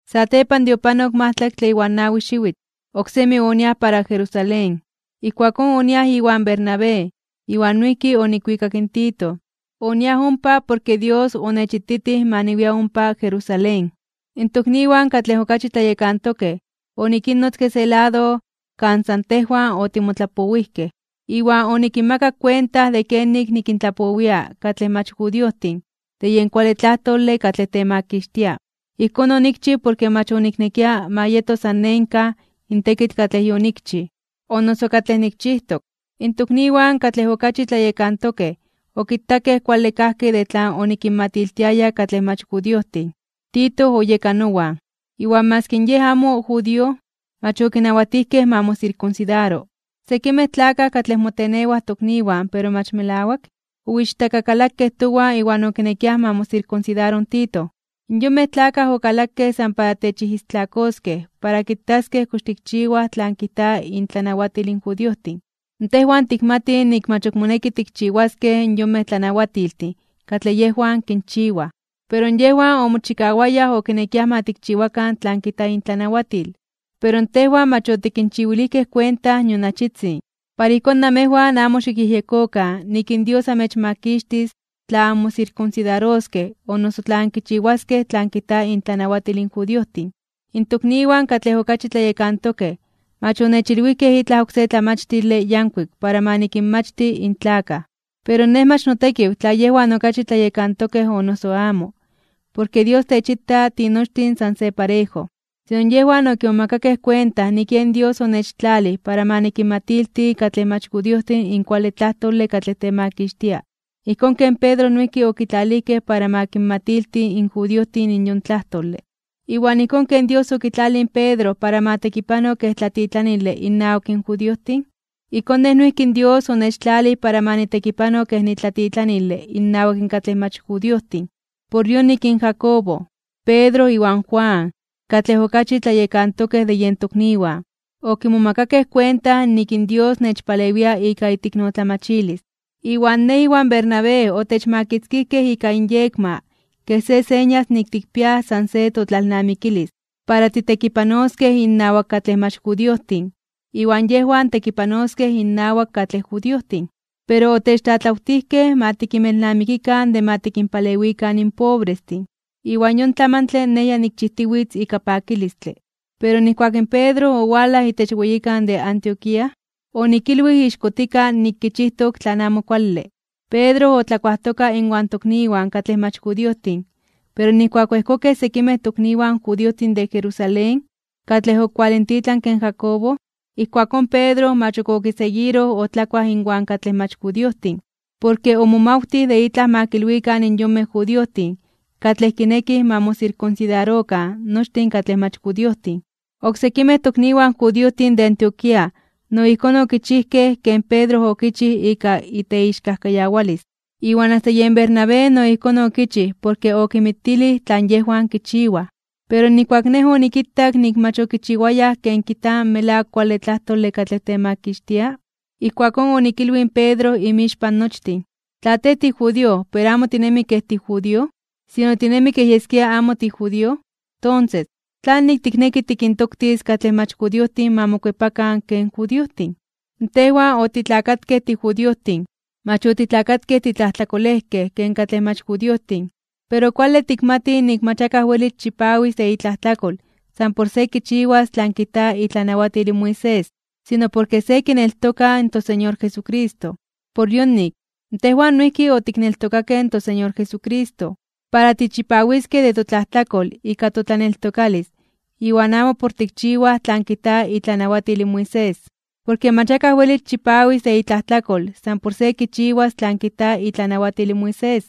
Satepan de opanok majtlaktle iwan nawi xiwitl, oksemi oniaj para Jerusalén. Ijkuakón oniaj iwan Bernabé, iwan noijki onikwikak in Tito. Oniaj ompa porke Dios onechititij ma niwia ompa Jerusalén. In tokniwan katlej okachi tlayekantokej onikinnotzke se lado kan san tejwan otimotlapowijkej. Iwan onikinmakak kuenta de kenik nikintlapowia katlej mach judiojtin de yen kuale tlajtole katlej temakixtia. Ijkón onikchij porke mach oniknekia ma yeto san nenkaj (en vano) in tekitl katlej yonikchij o noso katlej nikchijtok. In tokniwan katlej okachi tlayekantokej okitakej kuale kajki de tlan onikinmatiltiaya katlej mach judiojtin. Tito oyeka nowan. Iwan maski yej amo judío, mach okinawatijkej ma mosirkunsidaro. Sekimej tlakaj katlej motenewaj tokniwan pero mach melawak, oichtakakalakej towan iwan okinekiaj ma mosirkunsidaro in Tito. Yonmej tlakaj okalakej san para techijistlakoskej para kitaskej kox tikchiwaj tlan kijta intlanawatil in judiojtin. Tejwan tikmatij nik mach ok moneki tikinchiwaskej yonmej tlanawatiltin katlej yejwan kinchiwaj. Pero yejwan omochikawayaj okinekiaj ma tikchiwakan tlan kijta intlanawatil. Pero tejwan mach otikinchiwilijkej kuenta nion achitzin, para ijkón namejwan amo xikyejyekokan nik in Dios amechmakixtis tla anmosirkunsidaroskej o noso tla ankichiwaskej tlan kijta intlanawatil in judiojtin. In tokniwan katlej okachi tlayekantokej mach onechilwijkej itlaj oksé tlamachtile yankuik para ma nikinmachti in tlakaj. Pero nej mach notekiw tla yejwan okachi tlayekantokej o noso amo, porke Dios techita tinochtin san se parejo. Sino yejwan okimomakakej kuenta nik yen Dios onechtlalij para ma nikinmatilti katlej mach judiojtin in kuale tlajtole katlej temakixtia, ijkón ken Pedro noijki okitlalijkej para ma kinmatilti in judiojtin in yon tlajtole. Iwan ijkón ken Dios okitlalij in Pedro para ma tekipano kej tlatitlanile innawak in judiojtin, ijkón nej noijki in Dios onechtlalij para ma nitekipano kej nitlatitlanile innawak katlej mach judiojtin. Por yonik Jacobo, Pedro iwan Juan, katlej okachi tlayekantokej de yen tokniwan, okimomakakej kuenta nik in Dios nechpalewia ika iteiknotlamachilis. Iwan nej iwan Bernabé otechmakitzkijkej ika inyekma kej se señas nik tikpiaj san se totlalnamikilis, para titekipanoskej innawak katlej mach judiojtin, iwan yejwan tekipanoskej innawak katlej judiojtin. Pero otechtlatlawtijkej ma tikinmelnamikikan de ma tikinpalewikan in pobrestin, iwan yon tlamantle nej ya nikchijtiwitz ika pakilistle. Pero nijkuak in Pedro owalaj itech weyikan de Antioquía, onikilwij ixkotika nik kichijtok tlan amo kuale. Pedro otlakuajtoka inwan tokniwan katlej mach judiojtin, pero nijkuak oejkokej sekimej tokniwan judiojtin de Jerusalén, katlej okualintitlanke in Jacobo, ijkuakón in Pedro mach ok okiseguiroj otlakuaj inwan katlej mach judiojtin. Porke omomawtij de itlaj ma kilwikan in yonmej judiojtin katlej kinekij ma mosirkunsidarokan nochtin katlej mach judiojtin. Oksekimej tokniwan judiojtin de Antioquía no ijkón okichijkej ken Pedro okichij ika iteixkajkayawalis. Iwan asta yen Bernabé no ijkón okichij porke okinmitilij tlan yejwan kichiwaj. Pero nijkuak nej onikitak nik mach okichiwayaj ken kijta in melawak kuale tlajtole katlej temakixtia, ijkuakón onikilwij in Pedro inmixpan nochtin: “Tla tej tijudío, pero amo tinemi kej tijudío, sino tinemi kej yeskia amo tijudío, tonses, ¿tlanik tikneki tikintoktis katlej mach judiojtin ma mokuepakan ken judiojtin?” Tejwan otitlakatkej tijudiojtin, mach otitlakatkej titlajtlakolejkej ken katlej mach judiojtin. Pero kuale tikmatij nik mach akaj welis chipawis de itlajtlakol san por se kichiwas tlan kijta itlanawatil in Moisés. Sino porke se kineltoka in toSeñor Jesucristo. Por yonik, tejwan noijki otikneltokakej in toSeñor Jesucristo, para tichipawiskej de totlajtlakol ika totlaneltokalis iwan amo por tikchiwaj tlan kijta itlanawatil in Moisés. Porke mach akaj welis chipawis de itlajtlakol san por se kichiwas tlan kijta itlanawatil in Moisés.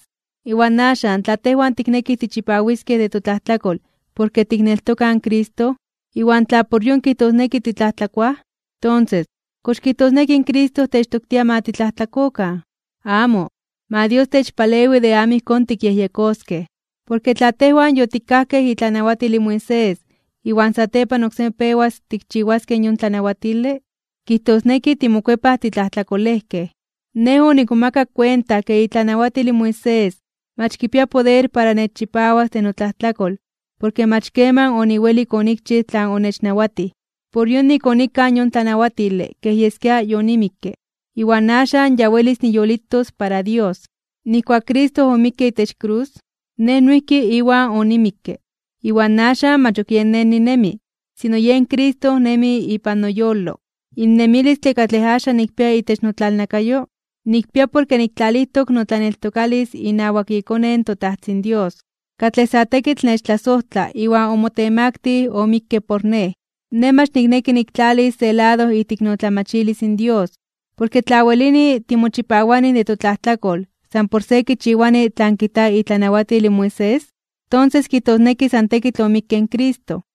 Iwan axan, tla tejwan tiknekij tichipawiskej de totlajtlakol porke tikneltokaj in Cristo, iwan tla por yon kijtosneki titlajtlakoa, tonses ¿kox kijtosneki in Cristo techtoktia ma titlajtlakokan? ¡Amo! Ma Dios techpalewi de amo ijkón tikyejyekoskej. Porke tla tejwan yotikajkej itlanawatil in Moisés iwan satepan oksemi pewas tikchiwaskej yon tlanawatile, kijtosneki timokuepaj titlajtlakolejkej. Nej onikmomakak kuenta ke itlanawatil in Moisés mach kipia poder para nechchipawas de notlajtlakol porke mach keman oniwelik onikchij tlan onechnawatij, por yonik onikaj yon tlanawatile kej yeskia yonimikke. Iwan axan ya welis niyolitos para Dios. Nijkuak Cristo omikke itech krus, nej noijki Iwan onimikke. Iwan axan mach ok yen nej ninemi, sino yen Cristo nemi ipan noyolo. In nemilistle katlej axan nikpia itech notlalnakayo, nikpia porke niktlalijtok notlaneltokalis inawak iKone in toTajtzin Dios, katlej sa tekitl nechtlasojtla iwan omotemaktij (omotemaktilij) omikke por nej. Nej mach nikneki niktlalis se lado iteiknotlamachilis in Dios. Porke tla welini timochipawanij de totlajtlakol san por se kichiwani tlan kijta itlanawatil in Moisés, tonses kijtosneki san tekitl omikke in Cristo.